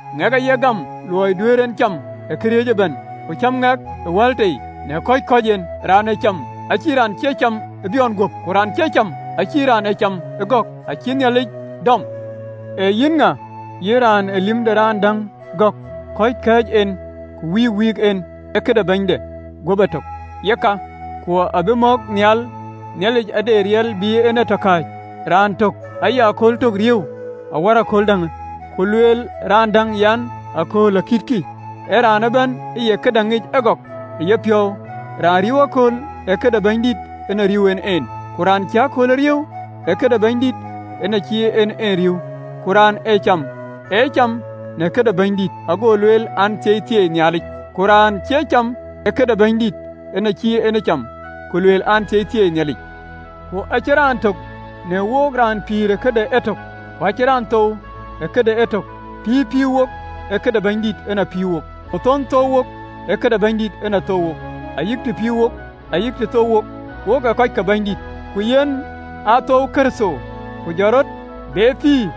Ŋɛk aye gäm luɔi duëër en cam ë këriëëc ëbɛ̈n, ku cäm ŋɛk ë wal tei, në kɔ̈c kɔ̈ɔ̈c en. Raan ee cam, ë cïï raan cie cam ë biɔɔn guöp, ku raan cie cam, ë cïï raan ë cam ee gɔ̈k, acïï Nhialic dɔm. Ee yïn ŋa, yïn raan ee lïm de raan däŋ gɔ̈k? Kɔ̈ɔ̈c kɛ̈ɛ̈c en, ku wïïk wïïk en, ee këde bɛ̈nyde guöp etök. Yeka, ku abï mɔ̈k nhial, Nhialic ade riɛl bï en tɔ kääc. Raan tök aye kööl tök riëëu awär kööl däŋ, ku lueel raan däŋ an, akööl akïtkï. Ë raan ëbɛ̈n ë ye këdäŋ ŋic ëgɔk ë yepiɔ̈u. Raan riëëu akööl, ee këde Bɛ̈nydït en a riëëu en en, ku raan cïï akööl ee riëëu, ee këde Bɛ̈nydït en acïï en en ee riëëu. Ku raan ee cam, ee cam në këde Bɛ̈nydït, ago lueel an, Thieithieei Nhialic, ku raan cie cam, ee këde Bɛ̈nydït en acïï en ee cam, ku lueel an, Thieithieei Nhialic. Ku acïn raan tök në wook, raan pïïr ë këde etök, ku acïn raan thou ë këde etök. Pïïr pïïr wok, ee këde Bɛ̈nydït en pïïr wok, ku thon thou wok, ee këde Bɛ̈nydït en thou wok, ayï të pïïr wok ayï të thou wok, wok ee kɔc ke Bɛ̈nydït. Ku yen aa thouwë Kërtho, ku jɔt rɔt be pïïr,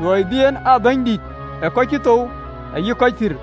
luɔi bï en aa Bɛ̈nydïït ë kɔc cï thou ayï kɔc pïïr.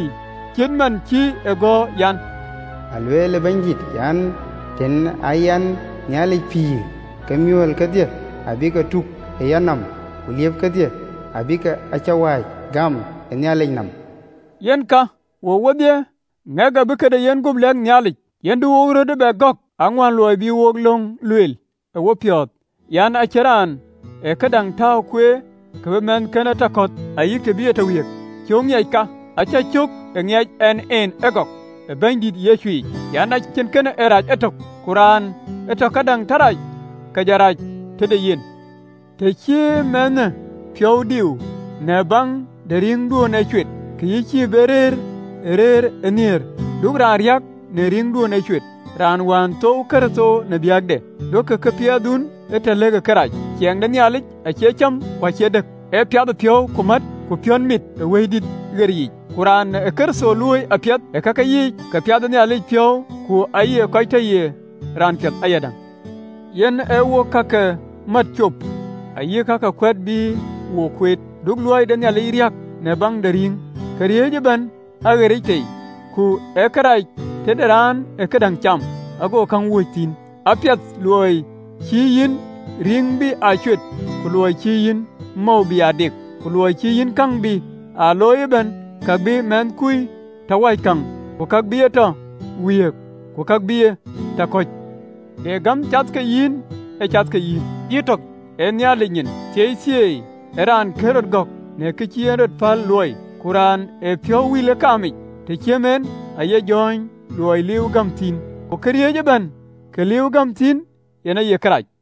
(LXX). Cït man cï ë gɔ̈ɔ̈r an, “Alueel Bɛ̈nydït an, Tën aa yɛn Nhialic pïïr, ke miɔɔl kedhie abï ke tuk ë Yanɔm. Ku liëp kedhie abïk awɛ̈ɛ̈c gam ë Nhialic nɔm.” Yen ka, wook wodhie, ŋɛk abï këde yenguöp lɛ̈k Nhialic. Yen du wo röt ee bɛ gɔ̈k, aŋuän luɔi bï wok löŋë lueel ë wopiɔ̈ɔ̈th an, “Ë cïn raan ee këdäŋ tääu kueer, kë bï mɛnhkënë tɔ kɔ̈th, ayï kë bï e tɔ wiëëk. Cöök ŋiɛc kï, acä cök ë ŋiɛc ɛn en ëgɔk ë Bɛ̈nydït Yecu yic an, acïn kën ee rac etök, ku raan ë tɔ këdäŋ rac, ke jɔ rac tëde yen. Të cï mɛnhkui piɔ̈u diu në baŋ de rïïŋduön ë cuet, ke yïn cïï be rëër ë rëër ë nhiëër. Du raan riäk në rïïŋduön ë cuet, raan wään thouwë Kërtho në biäkde. Duökï piathdun ee tɔ lëkë kërac. Ciɛɛŋ de Nhialic acie cäm ku acie dëk, ee piathëpiɔ̈u, ku mät, ku piɔ̈nmit ë Wëidït ɣer yiic. Ku raan ë Kërtho luööi apiɛth ë kake yiic, ka piɛth ë Nhialic piɔ̈u, ku aye kɔc tɔ ye raan piɛth ayadäŋ. Yen ee wok ka ke mät cop ayï ka ke kuɛ̈t bï wok kueet. Du luɔi de Nhialic riäk në baŋ de rïŋ. Këriëëc ëbɛ̈n aɣeric tei, ku ee kërac tëde raan ë këdäŋ cam, ago käŋ wööc thïn. Apiɛth luɔi cïï yïn rïŋ bï aa cuet, ku luɔi cïï yïn mɔ̈u bï aa dek, ku luɔi cï yïn käŋ bï aa looi ëbɛ̈n, ka bï mɛnhkui tɔ wäc käŋ, ku ka bï e tɔ wiëëk, ku ka bï e tɔ kɔ̈c. De gäm cath ke yïn? Ë cath ke yïn yïtök ë Nhialic nyin. Thieithieei ë raan raan kën rɔt gɔ̈k në kë cï en rɔt päl luɔi. Ku raan ee piɔ̈u wïl ë kaamic, të ciëm en, aye jɔ̈ɔ̈ny, luɔi liiuwë gäm thïn, ku këriëëc ëbɛ̈n kë liiuwë gäm thïn, yen aye kërac.